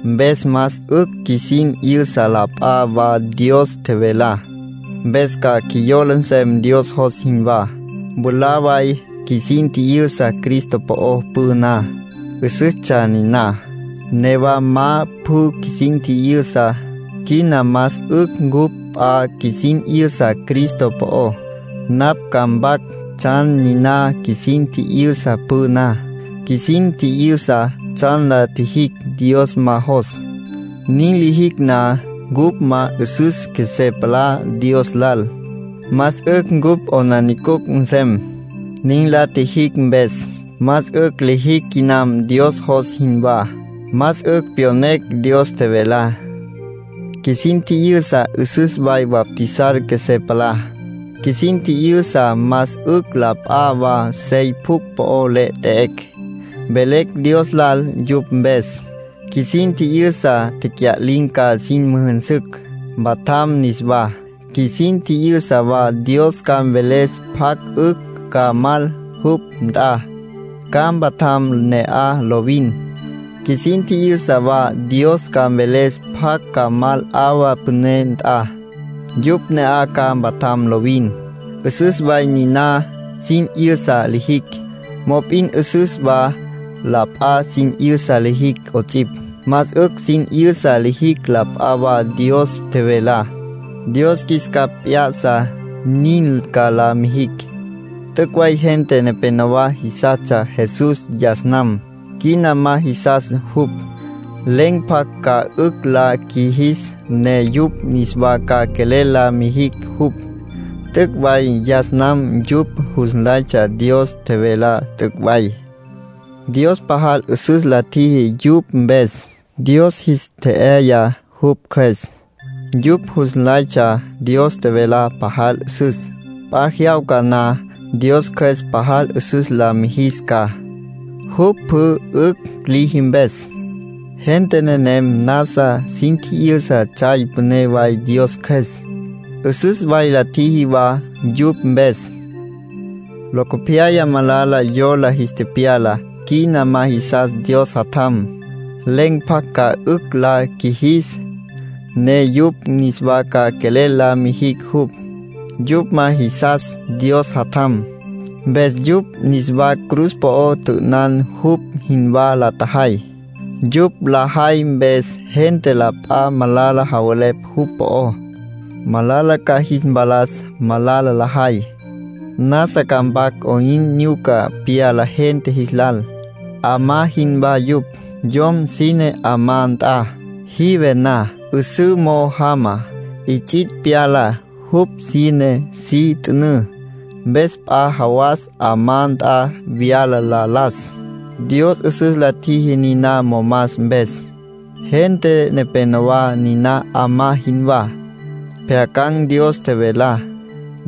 Mpes más 'ücj qjuisin 'yüsa la p'a wa Dios tjevelá. Mpes ca qjuiyola nsem Dios jos jinwá. Mwalá way qjuisin tji'yüsa Cristo po'ó püná, 'üsüstsja niná. Newa ma pjü qjuisin tji'yüsa. Quina más 'ücj cupj p'a qjuisin 'yüsa Cristo po'ó. Napj ca mpac tsjan niná qjuisin tji'yüsa püná. Qjuisin tji'yüsa tsjan la tjijicj Dios ma jos. Nin lijicj na, cupj ma 'üsüs qjuesé palá Dios lal. Más 'ücj cupj 'aplijila nsem, nin la tjijicj mpes; más 'ücj lijicj quinam Dios jos jinwá. Más 'ücj pyonecj Dios tjevelá. Qjuisin tji'yüsa 'üsüs way bautizar qjuesé palá. Qjuisin tji'yüsa más 'ücj la p'a wa sey pjucj po le 'et'ecj, velecj Dios lal yupj mpes. Qjuisin tji'yüsa tecya'lin̈ ca sin müjünsücj, mpatjam niswá. Qjuisin tji'yüsa wa Dios ca mveles pjacj 'ücj ca mal jupj nt'a, ca mpatjam ne'aj lovin. Qjuisin tji'yüsa wa Dios ca mveles pjacj ca mal 'awa püné nt'a. Yupj ne'aj ca mpatjam lovin. 'Üsüs way niná sin 'yüsa lijicj. Mop'in 'üsüs wa la p'a sin 'yüsa lijicj 'ots'ipj. Más 'ücj sin 'yüsa lijicj la p'a wa Dios tjevelá. Dios qjuis capj p'ya'sa, nin ca la mijicj. T'üc' way gente nepénowa jisastsja Jesús yas nam; quina ma jisas jupj. Len̈ pjacj ca 'ücj la qjuijis ne yupj niswa ca quelel la mijicj jupj. T'üc' way yas nam yupj jus nlaytsja Dios tjevelá t'üc' way. Dios pajal 'üsüs la tjiji yupj mpes. Dios jis tje'yaya jupj Cjües. Yupj jus nlaytsja Dios tjevelá pajal 'üsüs. P'a jyawca na Dios Cjües pajal 'üsüs la mijis ca, jupj pjü 'ücj liji mpes. Gente nenem nasa sin tji'yüsa tsjay püné way Dios Cjües. 'Üsüs way la tjiji wa yupj mpes. Locopyaya malala yola jis tepyala. Quina ma jisas Dios Jatjam. Len̈ pjacj ca 'ücj la qjuijis ne yupj niswa ca quelel la mijicj jupj. Yupj ma jisas Dios Jatjam, mpes yupj niswa cruz po'o tjü'ünan jupj jinwá la tjajay. Yupj lajay mpes gente la p'a malala javelepj jupj po'ó. Malala ca jis mpalas malala lajay. Nasa ca mpac 'oyn nyuca pyala gente jis lal. 'Amá jinwá yupj. Yom sine 'amá nt'a. Jive na, 'üsǘ mo'o jama, 'its'its' pyala. Jupj sine si t'ünǘ. Mpes p'a jawas 'amá nt'a vyala la las. Dios 'üsüs la tjiji niná momas mpes. Gente nepénowa niná 'amá jinwá. Pjyacan̈ Dios tjevelá.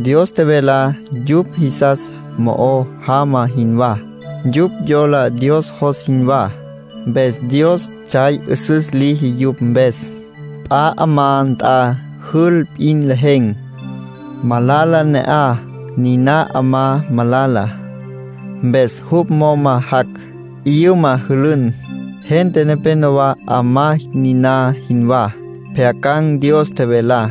Dios tjevelá yupj jisas mo'o jama jinwá. Yupj yola Dios jos jinwá. Mpes Dios tsjay 'üsüs liji yupj mpes. P'a 'amá nt'a jül p'in lejen̈, malala ne'aj. Niná 'amá malala. Mpes jupj moma jac', 'yüma jülün. Gente nepénowa 'amá niná jinwá. Pjyacan̈ Dios tjevelá.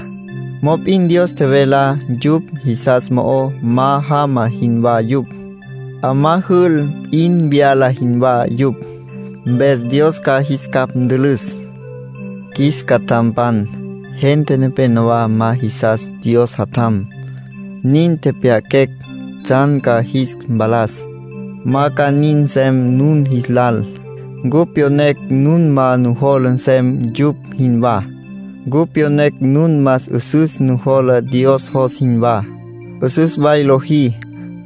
Mop'in Dios tjevelá yupj jisas mo'o ma jama jinwá yupj. 'Amá jül p'in vyala jinwá yupj. Mpes Dios ca jis capj ntülüs. Qjuis catjampan, gente nepénowa ma jisas Dios Jatjam. Nin tepyaquecj tsjan ca jis mpalas. Ma ca nin nsem nun jis lal. Cupj pyonecj nun ma nujola nsem yupj jinwá. Cupj pyonecj nun más 'üsüs nujola Dios jos jinwá. 'Üsüs way lojí;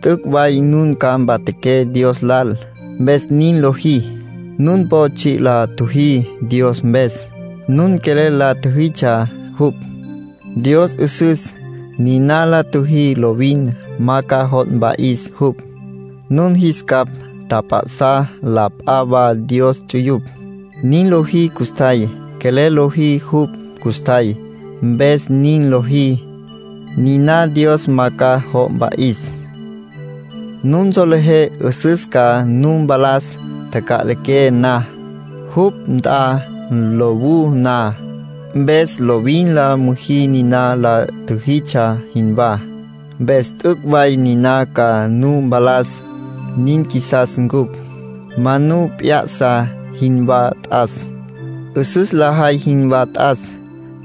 t'üc' way nun ca mpatjaqué Dios lal, mpes nin lojí. Nun po tsji' la tjüjí Dios mpes. Nun quelel la tjüjitsja jupj. Dios 'üsüs. Niná la tjüjí lovin ma ca jo' mpa'is jupj. Nun jis capj tjap'a'sá la p'a wa Dios ts'uyupj. Nin lojí custjay; quelel lojí jupj custjay, mpes nin lojí. Niná Dios ma ca jo' mpa'is. Nun solejé 'üsüs ca nu mpalas taca'liqué na, jupj nt'a lowú na. Mpes lovin la müjí niná la tjüjitsja jinwá, mpes t'üc' way niná ca nu mpalas. Nin qjuisas ncupj. Ma nu pjyasa jinwá t'as. 'Üsüs lajay jinwá t'as.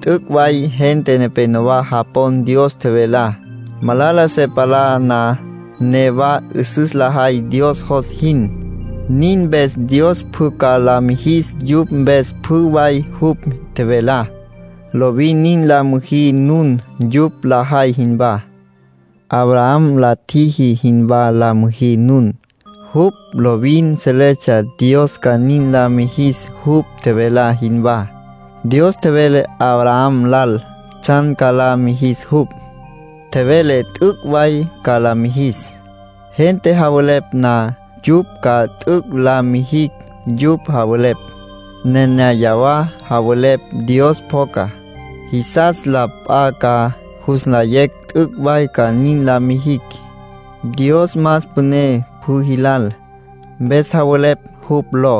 T'üc' way gente nepénowa japon Dios tjevelá. Malala se palá na, newa 'üsüs lajay Dios jos jin. Nin mpes Dios pjü ca la mijis yupj mpes pjü way jupj tjevelá. Lovin nin la müjí nun, yupj lajay jinwá. Abraham la tjiji jinwá la müjí nun. Jupj lovin seletsja Dios ca nin la mijis jupj tjevelá jinwá. Dios tjevele Abraham lal tsjan ca la mijis jupj. Tjevele t'üc' way ca la mijis. Gente javelepj na yupj ca t'üc' la mijicj yupj javelepj, nenéyawa javelepj Dios pjoca. Jisas la p'a ca jus nlayecj t'üc' way ca nin la mijicj. Dios más püné pjü jilal, mpes javelepj jupj ló.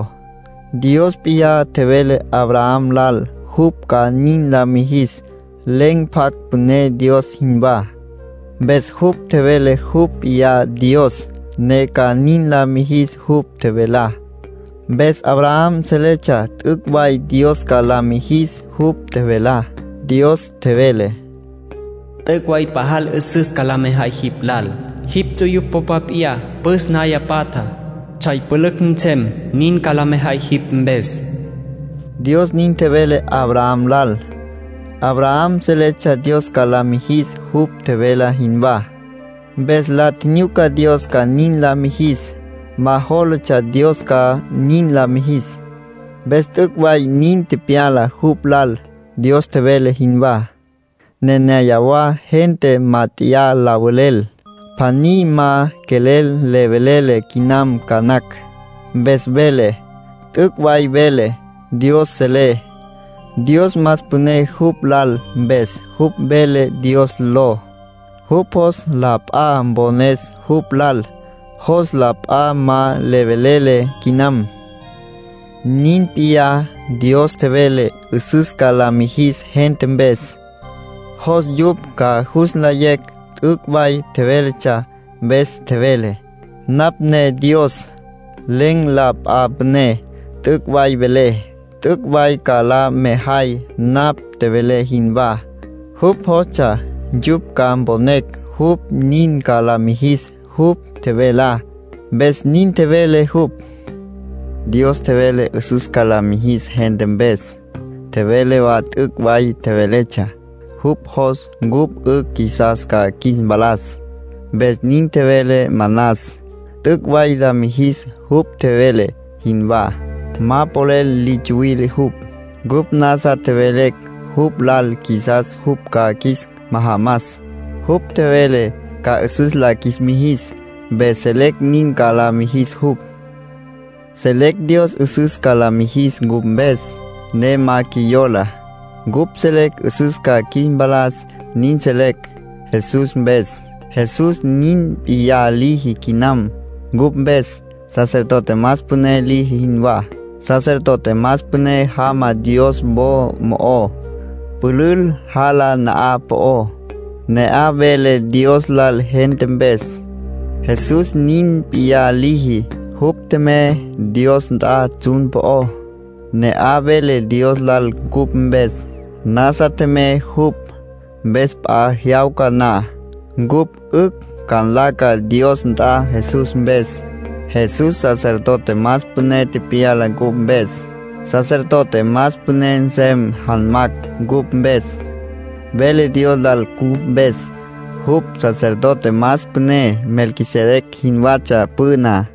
Dios p'iyá tjevele Abraham lal jupj ca nin la mijis. Len̈ pjacj püné Dios jinwá. Mpes jupj tjevele jupj p'iyá Dios, ne ca nin la mijis jupj tjevelá. Mpes Abraham seletsja t'üc' way Dios ca la mijis jupj tjevelá. Dios tjevele: “T'üc' way pajal 'üsüs ca la mejay jipj lal. Jipj ts'uyupj popa p'iyá püs naya patja, tsjay pülücj nsem, nin ca la mejay jipj mpes.” Dios nin tjevele Abraham lal. Abraham seletsja Dios ca la mijis jupj tjevele jinwá. Mpes la tjinyuca Dios ca nin la mijis. Ma jólatsja Dios ma ca nin la mijis. Mpes t'üc' way nin tepyala jupj lal, Dios tjevele jinwá. Nenéyawa gente mát'eya la velel. Pjaní ma quelel le velele quinam ca nacj. Mpes vele: “T'üc' way velé, Dios selé”. Dios más püné jupj lal mpes jupj vele Dios ló. Jupj jos la p'a mpones jupj lal. Jos la p'a ma le velele quinam. Nin p'iyá, Dios tjevele 'üsüs ca la mijis gente mpes. Jos yupj ca jus nlayecj t'üc' way tjevéletsja. Mpes tjevele: “Napj ne Dios, len̈ la p'a püné. T'üc' way velé, t'üc' way ca la mejay napj tjevelé jinwá.” Jupj jostsja yupj ca mponecj jupj nin ca la mijis jupj tjevelá, mpes nin tjevele jupj. Dios tjevele 'üsüs ca la mijis gente mpes. Tjevele wa t'üc' way tjevéletsja. Jupj jos cupj 'ücj qjuisas ca qjuis mpalas, mpes nin tjevele manas. T'üc' way la mijis jupj tjevele jinwá. Ma polel li tsuwile jupj. Cupj nasa tjevelecj jupj lal qjuisas jupj ca qjuis majamas. Jupj tjevele ca 'üsüs la qjuis mijis, mpes selecj nin ca la mijis jupj. Selecj Dios 'üsüs ca la mijis cupj mpes, ne ma qjuiyola. Cupj selecj 'üsüs ca qjuis mpalas. Nin selecj Jesús mpes. Jesús nin p'iyá liji quinam cupj mpes, sacerdote más püné liji jinwá. Sacerdote más püné jama Dios wo mo'ó, pülül jala na'aj po'ó, ne'aj vele Dios lal gente mpes. Jesús nin p'iyá liji. Jupj tjemey Dios nt'a tsjun po'ó, ne'aj vele Dios lal cupj mpes. Nasa tjemey jupj. Mpes p'a jyawca na, cupj 'ücj ca nlaca Dios nt'a Jesús mpes. Jesús sacerdote más püné tepyala cupj mpes. Sacerdote más püné nsem janmacj cupj mpes. Vele Dios lal cupj mpes. Jupj sacerdote más püné Melquisedec jinwatsja püná.